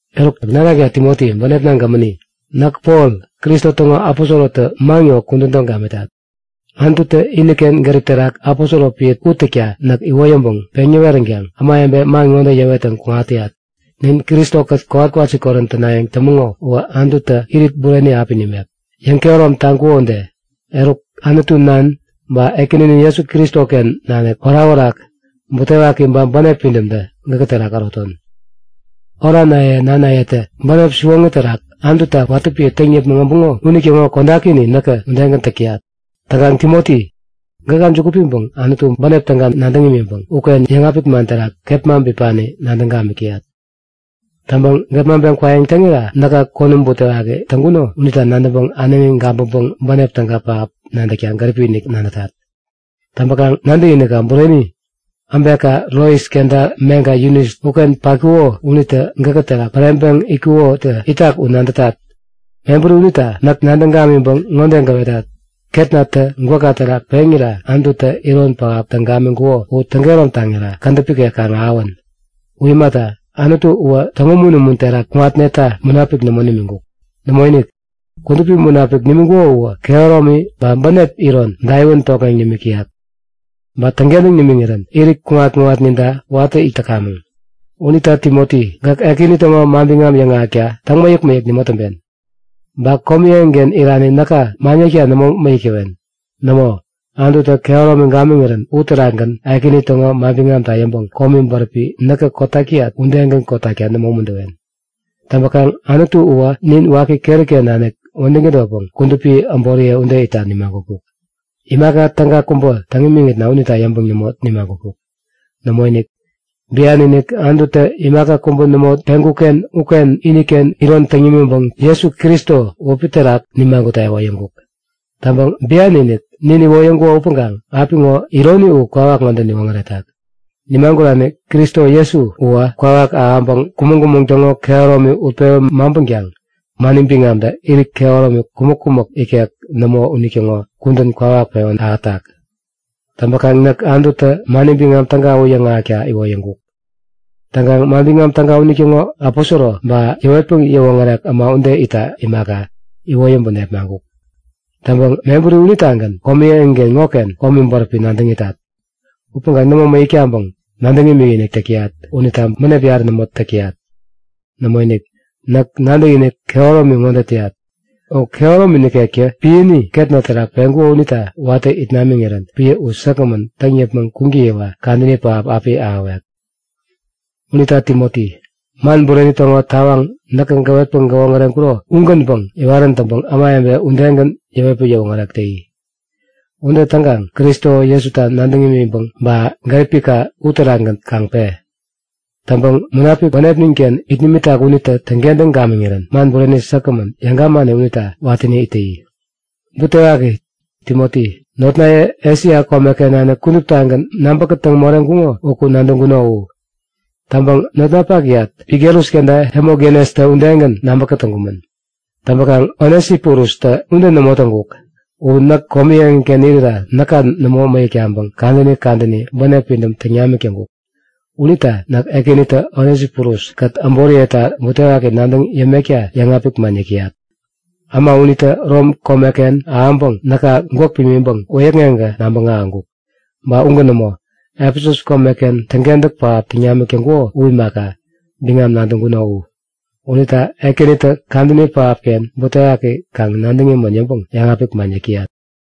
Eruk nanakna Timoti bänepna gämäni, näk Pol, Kristo täŋo aposorotä man ŋo kudän täŋ gamitat. Anututä iniken gärip terak aposoro piä u täkta näk iwoyäŋpäŋ peŋ näweränkaŋ ämawebe man ŋode yäwettäŋ kuŋat täyat; Nin Kristo-kät kowat-kwasikorän tänayäŋ tämäŋo uwä Anututä irit bureni api nimek, yäŋkehärom taŋkuko ude. Eruk Anutu Nan, ba Ekäninin Jesu Kristoken nanik orakorak, butewaki ba bänep pidämtä gäkä terak äroton. Oranaye nanayetä bänep siwoŋi terak Anututa watä piä täŋ yäpmäŋ äbuŋo unitäŋo kodakini näkä udegän täk täyat. Täŋkaŋ Timoti, gäka juku piŋpäŋ Anutu bänep täga nadäŋ imiŋpäŋ uken yäŋapik man terak kepma bipani nadäŋ gamik täyat. Täŋpäŋ gepmaŋpeŋ kwayäŋ täŋira näka konäm butewaki täŋkuno unita nadäŋpäŋ äneŋi gabäŋpäŋ bänep täga pähap nadäkta gäripi-inik nadätat. Täŋpäkaŋ nadäkinikka bureni, äbekka Lois kenta meŋka Yunis uken patkuko unitä gäkä terak päreŋpäŋ itkukotä itak u nadätat. Mebäri unita näk nadäŋ gamiŋpäŋ ŋode gäwetat; Ketnatä gwäkka terak peŋira Anututä iron pähap täŋ gamiŋkuko u täŋkehärom taŋiri kädäp ikek kaŋ ahäwän. U imata, Anutu uwä täŋumun-umun terak kuŋatneta Munapik nämo nimiŋkuk. Nämoinik, Kudupi Munapiki nimiŋkuko uwä kehäromi ba bänep iron daiwän tokŋeŋ nimik täyak. Ba täŋkentäŋ nimiŋirän irit kuŋat-kuŋatninta watä it täkamäŋ. Unita Timoti gäk Ekäni täŋo manbiŋam yäŋahäkta täŋmäyäk-mäyäk nämo täŋpen. Ba komi eŋiken irani näka man yäkta nämo mäyäk täwen. Nämo, Anututä kehäromi gamiŋirän uterakgän Ekäni täŋo manbiŋamta yäŋpäŋ komi bäräpi näkä kotak täyat udegän kotakta nämo umuntäwen. Täŋpäkaŋ Anutu uwä nin waki keri-ken nanik wädäŋ tädotpäŋ kudupi äboriye ude itta nimagutkuk. Imaka täga kubä täŋ imiŋitna unita yäŋpäŋ nämo nimagutkuk. Nämoinik! Bian-inik, Anututä imaka kubä nämo peŋkuk-ken uken iniken iron täŋ nimiŋpäŋ Jesu Kristo wäpi terak nimagutta iwoyäŋkuk. Täŋpäŋ bian-inik nin iwoyäŋkuko upäŋkaŋ apiŋo ironi u kwawak ŋode niwoŋäretak; Nimagurani Kristo Jesu uwä kwawak ahäŋpäŋ kumäŋ-kumäŋ täŋo kehäromi utpewän maŋpänkaŋ, mani biŋamtä irit kehäromi kumäk-kumäk ikek nämo unitäŋo kudän kwawak pewän ahätak. Täŋpäkaŋ näk Anututä mani biŋam täga u yäŋahäkta iwoyäŋkuk. Täŋkaŋ Manbiŋam Täga unitäŋo aposoro ba yäwetpäŋ yäwoŋärek äma ude itta imaka, iwoyäŋpäŋ nepmaŋkuk. Täŋpäŋ mebäri unitagän komi eŋi ŋoken komi bäräpi nadäŋ itat. Upäŋkaŋ nämo mäyäk taŋpäŋ, nadäŋ imikinik täk täyat unita bänep yarä nämo täk täyat. Nämoinik, näk nadäkinik kehäromi ŋode täyat; U kehäromi nikektä piäni ketna terak peŋkuko unita watä it namiŋirän piä u säkgämän täŋ yäpmäŋ kuŋtäyiwa kadäni pähap api ahäwek. Unita Timoti, man bureni täŋo tawaŋ näkä gäwetpäŋ gäwoŋäreŋkuro ugänpäŋ iwarän täŋpäŋ ämawebe udegän yäwetpäŋ yäwoŋärek täyi. Ude täŋkaŋ Kristo Jesuta nadäŋ imiŋpäŋ ba gäripka uterakgän kaŋ pe. Täŋpäŋ Munapik bänepnin-ken it nimitak unitä täŋkentäŋ gamiŋirän man bureni säkgämän yäŋ gamani unita watäni it täyi. Butewaki! Timoti, notnaye Esia komeken nanik kuduptagän nabäkätäŋ moreŋkuŋo uku nadäŋkuno u. Täŋpäŋ notnapakyat Figelus kenta Hemogenestä udegän nabä kätäŋkumän. Täŋpäkaŋ Onesiforustä ude nämo täŋkuk. U näk komi eŋiken irira näka nämo mäyäk taŋpäŋ kadäni kadäni bänep pidäm täŋ namik täŋkuk. Unita näk Ekänitä Onesiforus-kät äboriyeta butewaki nadäŋ yämekta yäŋapik man yäk täyat. Äma unitä Rom komeken ahäŋpäŋ näka gwäk pimiŋpäŋ wäyäkŋeŋkä nabäŋ ahäŋkuk. Ba ugän nämo, Efesus komeken täŋkentäk pähap täŋ namik täŋkuko u imaka, biŋam nadäŋkuno u. Unita Ekänitä kadäni pähapken butewaki kaŋ nadäŋ imän yäŋpäŋ yäŋapik man yäk täyat.